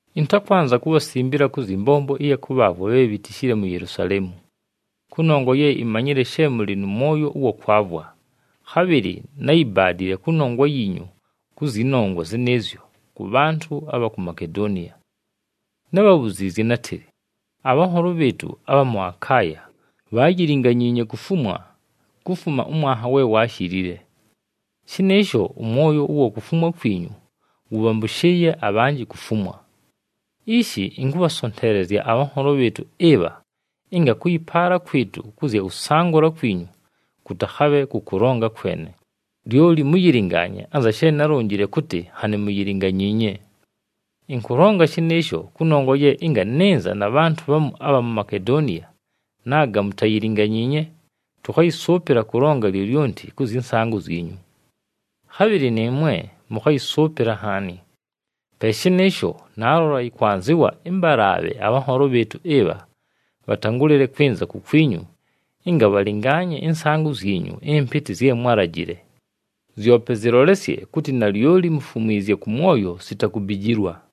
Ɨntakwanza kubhasimbila kʉ zyɨ mbombo ɨya kʉbhaavwa bhe bhitishile mu Yelusaleemu. Kʉnongwa ye imanyile she mʉlɨ nʉ mwoyo ʉwa kwavwa, khabhɨlɨ náyibaadile kʉnongwa yiinyu kʉ zyɨ nongwa zɨnɨɨzyo kʉ bhantʉ abha ku Makedoniya. Nábhabhuziizye nátɨlɨ, “Abhanholo bhɨɨtʉ abha mʉ Akaaya bhaayilinganyiinye kufumwa kufuma ʉmwanha we waashilile.” Shɨnɨɨsho ʉmwoyo ʉwa kufumwa kwinyu, wʉbhambʉshɨɨye abhinji kufumwa. Ishi ɨnkʉbhasonteelezya abhanholo bhɨɨtʉ ɨbha, ɨnga kʉyɨpaala kwɨtʉ kʉ zya kʉsangʉla kwinyu kʉtakhabhe kʉ kʉlonga kwene, lyoli mʉyɨlɨngaanye anza she nálonjile kʉtɨ nhanɨ muyilinganyiinye. Ɨnkʉlonga shɨnɨɨsho kʉnongwa ye ɨnga nɨnza na bhantʉ bhamu abha mu Makedoniya, naaga mutayilinganyiinye, tʉkhayɨsʉʉpɨla kʉlonga lyolyonti kʉ zyɨ nsaangʉ zyinyu. Khabhɨlɨ nɨɨmwe mʉkhayɨsʉʉpɨla nhaani. Pe shɨnɨɨsho, naalola yɨkwanzɨwa ɨmbalaabhe abhanholo bhɨɨtʉ ɨbha, bhatangʉlɨle kwɨnza kukwinyu, ɨnga bhalɨngaanye ɨnsaangʉ zyinyu ɨmpɨtɨ zye mwálajile. Zyope zɨlolesye kʉtɨ nalyoli mufumwizye kʉ mwoyo sita kubijilwa.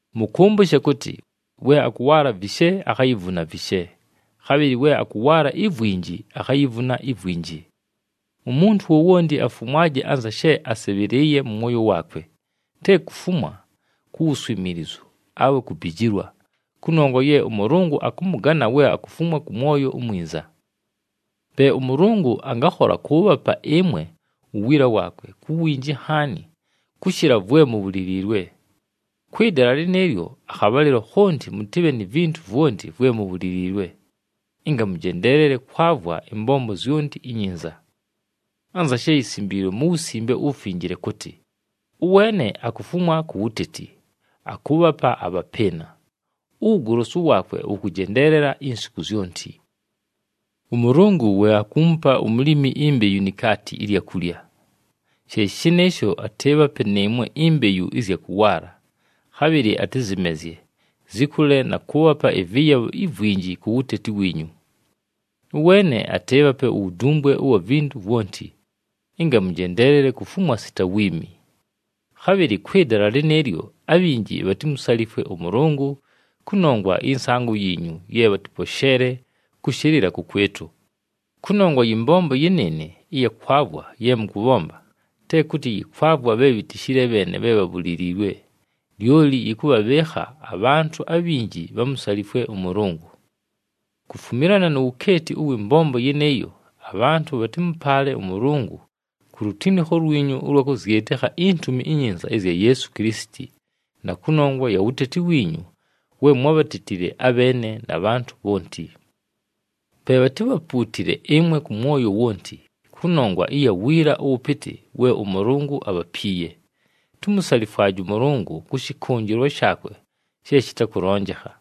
Mʉkʉmbʉshe kʉtɨ, “We akʉwaala vishe, akhayivuna vishe, khabhɨlɨ we akʉwaala ivwinji, akhayivuna ivwinji.” Umuntu wowonti afumwaje anza she asɨbhɨlɨɨye mʉ mwoyo waakwe, te kufumwa ku wuswimiilizu, awe kubijilwa, kʉnongwa ye ʉMʉlʉngʉ akʉmʉgana we akufumwa kʉ mwoyo umwinza. Pe ʉMʉlʉngʉ angakhola kʉʉbhapa ɨmwe uwiila waakwe ku winji nhaani kʉshɨla vwe mubhuliliilwe. Kwɨ dala lɨnɨɨlyo akhabhalɨlo khonti mʉtɨbhe ni vintu vwonti vwe mubhuliliilwe, ɨnga mʉjendeelele kwavwa ɨmbombo zyonti inyinza. Anza she yisimbiilwe mu Wusimbe uWufinjile kʉtɨ, “Ʉweene akufumwa ku wuteti, akʉʉbhapa abhapɨɨna, uwugolosu waakwe wʉkʉjendeelela insiku zyonti.” ɄMʉlʉngʉ we akuumupa umulimi imbeyu ni kaati ɨlya kulya. She shɨnɨɨsho atɨɨbhape nɨɨmwe imbeyu ɨzya kʉwaala, khabhɨlɨ atɨzɨmezye, zɨkʉle na kʉʉbhapa ɨvɨyabho ivwinji ku wuteti wiinyu. Ʉweene atɨɨbhape uwudumbwe ʉwa vintu vwonti, ɨnga mʉjendeelele kufumwa sita wiimi. Khabhɨlɨ kwɨ dala lɨnɨɨlyo abhinji bhatimusalifwe ʉMʉlʉngʉ kʉnongwa ɨyɨ nsaangʉ yiinyu ye bhatɨposheele kʉshɨlɨla kʉkwɨtʉ. Kʉnongwa yɨ mbombo yɨnɨɨnɨ ɨya kwavwa ye mʉkʉbhomba, te kʉtɨ yɨkwavwa bhe bhitishile bheene bhe bhabhuliliilwe, lyoli yɨkʉbhabhɨɨkha abhantʉ abhinji bhamusalifwe ʉMʉlʉngʉ. Kufumilana nu wukeeti ʉwɨ mbombo yɨnɨɨyo, abhantʉ bhatɨmʉpaale ʉMʉlʉngʉ ku lutinikho lwinyu ʉlwa kʉzyɨtɨkha iNtumi iNyinza ɨzya Yeesu Kilisiti, na kʉnongwa ya wuteti wiinyu we mwábhatetile abheene na bhantʉ bhonti. Pe bhatibhapuutile ɨmwe kʉ mwoyo wonti, kʉnongwa ɨya wiila ʉwʉpɨtɨ we ʉMʉlʉngʉ abhapiiye. Tumusalifwaje ʉMʉlʉngʉ kʉ shɨkʉnjɨlwa shaakwe she shɨtakʉlonjekha!